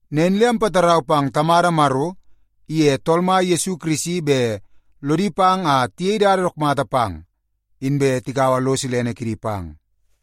Nen le ampatarau pang Tamada Maro iye Tool Mai Yesu Kirisi bet lodi pang a tiyei dada dook mata pang, inbe tikaua lo silene kidi pang.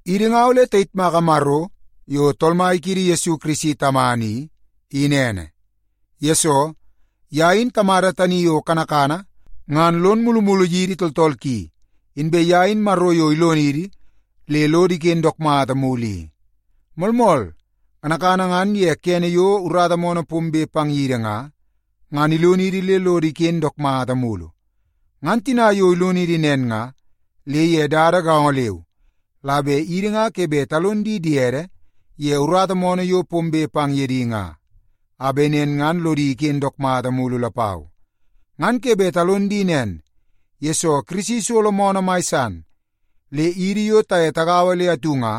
Idi nga ole tayitmaka Maro yo Tool Mai kiidi Yesu Kirisi Tamana i, in ene. Yesoo, ye in Tamada tani yo kanakana ngan lon mulumulu yidi tooltool ki, inbe ye in Maro yo ilonidi le lodo iken dook mata mulu i. Moolmool, kanakana ngan ye kene yo urata moonoo pombe pang yidi nga, ngan ilonidi le lodo iken dook mata mulu. Ngan tina yo ilonidi nen nga, le ye dada gaongo leu la bet idi nga ke bet talon di diede ye urata moonoo yo pombe pang ye di nga, a bet nen ngan lodi iken dook mata mulu lapau. Ngan ke bet talon di nen, yesoo Kirisi isolo moonoo mai san, le idi yo taye tagaua le atu nga,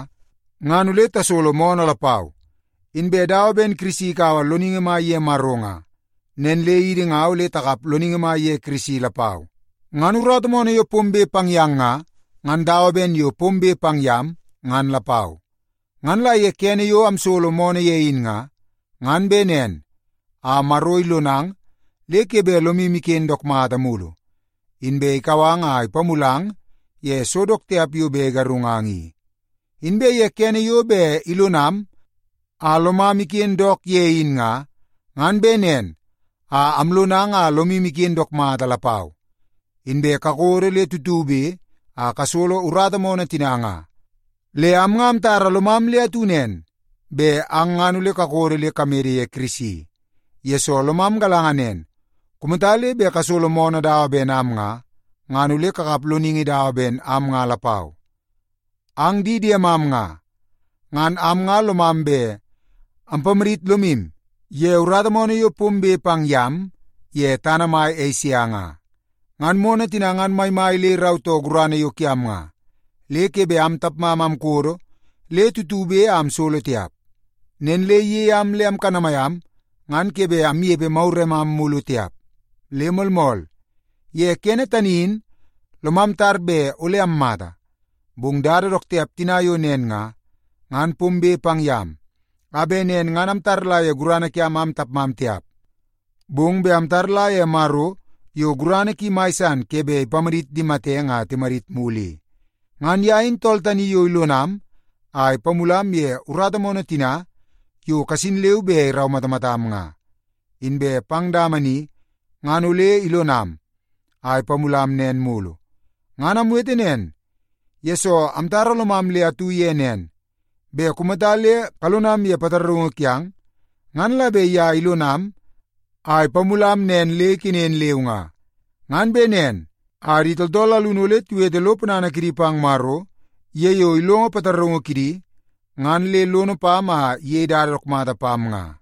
ngan ole tasolo moonoo lapau. Inbe dawa ben Kirisi ikaua loningi mai ye Maro nga, nen le idi nga ole takap loningi mai ye Kirisi lapau. Ngan urata moonoo yo pombe pang yang nga, ngan dawa ben yo pombe pang yam, ngan lapau. Ngan la ye kene yo amsolo moonoo ye in nga, ngan bet nen a Maro ilonang le ke bet lomu iken dook mata mulu, inbe ikau ang a ipamulang ye so dook tiap yo bet igarungang i. Inbe ye kene yo bet ilonam a lomam iken dook ye in nga, ngan bet nen a amlonang a lomu iken dook mata lapau, inbe kakodo le tutube a kasolo urata moonoo tina nga. Le am nga amtara lomam le atu nen, bet ang ngan ole kakodo le kamede ye Kirisi. Yesoo, lomam galanga nen, kumata le bet kasolo moonoo dawa ben am nga, ngan ole kakap loningi dawa ben am nga lapau. Ang di diemam nga, ngan am nga lomam bet ampamadit lomu ye urata moonoo yo pombe pang yam ye tana mai Esia nga. Ngan moonoo tina ngan maimai le irautoo gurana yo kiam nga, le ke bet am tapmam amkodo le tutube a amsolo tiap. Nen le iyei am le amkanamai am ngan ke bet amnepe maguremam mulu tiap. Le moolmool, ye kene tani in lomam tar bet ole ammata. Bong dada dook tiap tina yo nen nga, ngan pombe pang yam, a bet nen ngan amtaula ye gurana kiam am tapmam tiap, bong bet amtaula ye Maro yo gurana ki mai san ke bet ipamadit di matenge a timadit mulu i. Ngan ye in tool tani yo ilonam a ipamulam ye urata moonoo tina yo kasin leu be iraumatamatam nga. Inbe pang dama ni ngan ole ilonam a ipamulam nen mulu. Ngan amwete nen, yesoo amtara lomam le atu ye nen, bet kumata le kalonam ye pataraungu kiang, ngan la bet ye ilonam a ipamulam nen le ikenen leu nga. Ngan bet nen a di tooltool alunu ole tiwete lo ponana kidi pang Maro ye yo ilongo pataraungu kidi ngan le lono pam a iyei dada dook mata pam nga.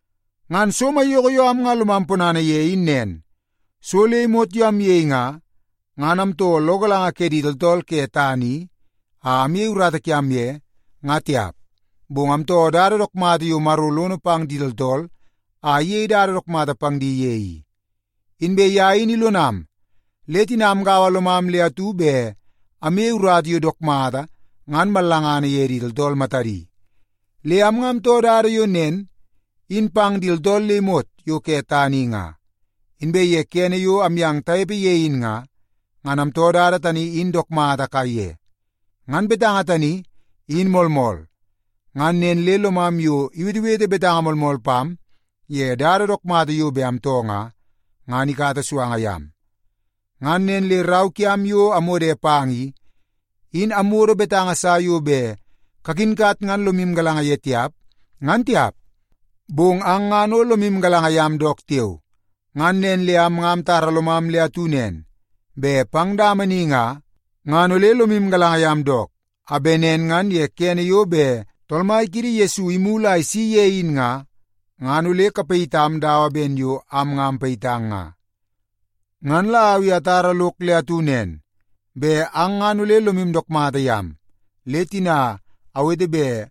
Ngan so maiyoko yo am nga lomam ponana ye in nen, so le imot yo amyei nga, ngan amtoo lo galanga ke di tooltool ke tana i la amyei urata kiam ye, nga tiap, bong amtoo dada dook mata yo Maro lono pang di tooltool a iyei dada dook mata pang di ye i. Inbe ye in ilonam, le tina amgaua lomam le atu bet amyei urata yo dook mata ngan mallangana ye di tooltool matadi. Le am nga amtoo dada yo nen in pang di tooltool le imot yo ke tana i nga, inbe ye kene yo amyang tanepe ye in nga, ngan amtoo dada tani in dook mata kaiye. Ngan betanga tani, in moolmool, ngan nen le lomam yo iwetewete betanga moolmool pam ye dada dook mata yo bet amtoo nga, ngan ikata suanga yam. Ngan nen le rau kiam yo amwode pang i, in amwodo betanga sa yo bet kakinkat ngan lomu galanga ye tiap, ngan tiap. Bong ang ngan o lomu galanga yam dook tiao. Ngan nen le am nga amtara lomam le atu nen, bet pang dama ni nga, ngan ole lomu galanga yam dook, a bet nen ngan ye kene yo bet Tool Mai kiidi Yesu imulu a isi ye in nga, ngan ole kapayitam dawa ben yo am nga ampayitang nga. Ngan la au i atara lok le atu nen, bet ang ngan ole lomu dook mata yam, le tina awete bet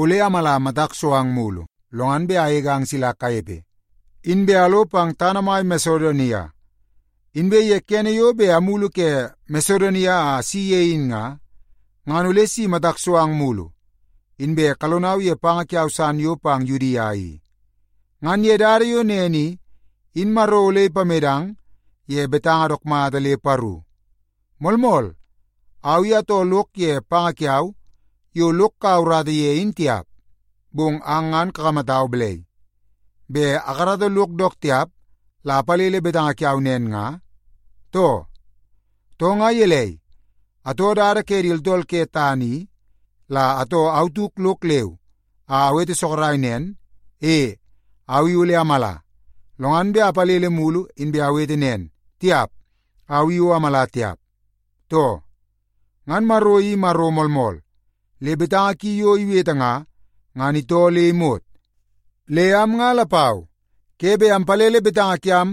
ole amala matak so ang mugu, lo ngan bet agegang sila kanepe, inbe alo pang tana mai Masedonia. Inbe ye kene yo bet amulu ke Masedonia a asi ye in nga, ngan ole si matak so ang mulu, inbe kalonau ye panga kiau san yo pang Yudia i. Ngan ye dada yo nen i, in Maro ole ipamedang ye betanga dook mata le paru. Moolmool, au i atoo lok ye panga kiau yo lok kaua urata ye in tiap. Bong ang ngan kakamatau balai, bet akarata lok dook tiap la apalele betanga kiau nen nga, too? Too, nga gelei, atoo dada ke di tooltool ke tana i la atoo au tauk lok leu a awete sorok nen, “E, au i ole amala”, lo ngan bet apalele mulu inbe awete nen, “Tiap, au i o amala tiap”, too? Ngan Maro i Maro moolmool, le betanga ki yo iwete nga, ngan itoo le imot. Le am nga lapau ke bet ampalele betanga kiam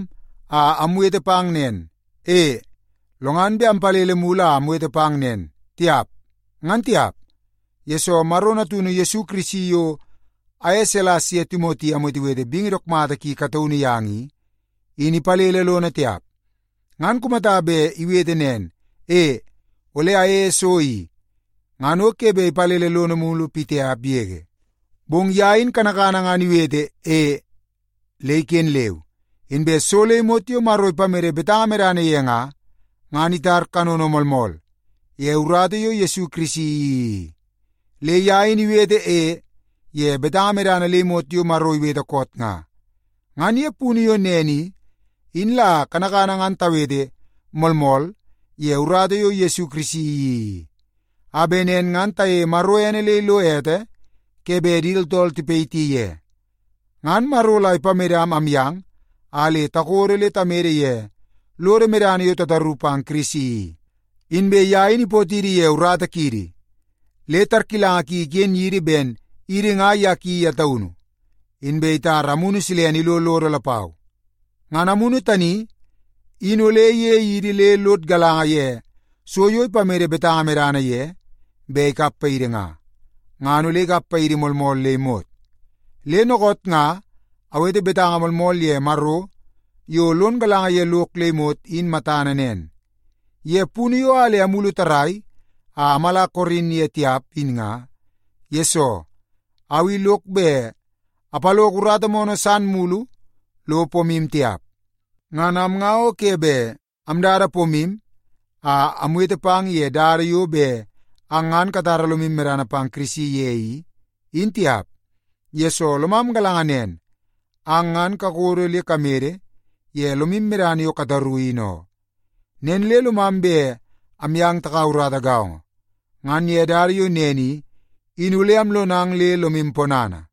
a amwete pang nen, “E”, lo ngan bet ampalele mulu a awete pang nen, “Tiap”, ngan tiap. Yesoo, Maro Natunu Yesu Kirisi yo aye Silas ye Timoti amwetewete bingi dook mata ki kataunu yang i, in ipalele lono tiap. Ngan kumata bet iwete nen, “E, ole ayeie so i,” ngan o ke bet ipalele lono mulu pitiap yege. Bong ye in kanakana ngan iwete “E” le iken leu. Inbe so le imot yo Maro ipamede betanga medana ye nga, ngan itar kanono moolmool ye urata yo Yesu Kirisi iyeii i. Le ye in iwete “E” ye betanga medana le imot yo Maro iwete koot nga. Ngan ye punu yo nen i, in la kanakana ngan tawete “Moolmool” ye urata yo Yesu Kirisi iyeii i, a bet nen ngan tayeie Maro ene le ilo ete ke bet di tooltool tipayiti ye. Ngan Maro la ipamedam amyang a le takodo le tamede ye lodo medana yo tataru pang Kirisi i. Inbe ye in ipootidi ye urata kiidi, le tarkilanga ki iken yidi ben idi nga ye ki ye taunu, inbe itara Amunu Silene ilo lodo lapau. Ngan Amunu tani in ole iyei idi le lod galanga ye so yo ipamede betanga medana ye bet ikap paidi nga, ngan ole ikap paidi moolmool le imot. Le dookoot nga awete betanga moolmool ye Maro yo lon galanga ye lok le imot in matana nen. Ye punu yo a le amulu tarrai a amala Korin ye tiap in nga, yesoo au i lok bet apaloko urata moonoo san mulu lo pomu tiap. Ngan am nga o ke bet amdada pomu a amwete pang ye dada yo bet ang ngan katara lomu medana pang Kirisi ye i, in tiap, yesoo lomam galanga nen, ang ngan kakodo le kamede ye lomu medana yo kataru, in oo. Nen le lomam bet amyang takaua urata gaongo, ngan ye dada yo nen i, in ole amlonang le lomu ponana.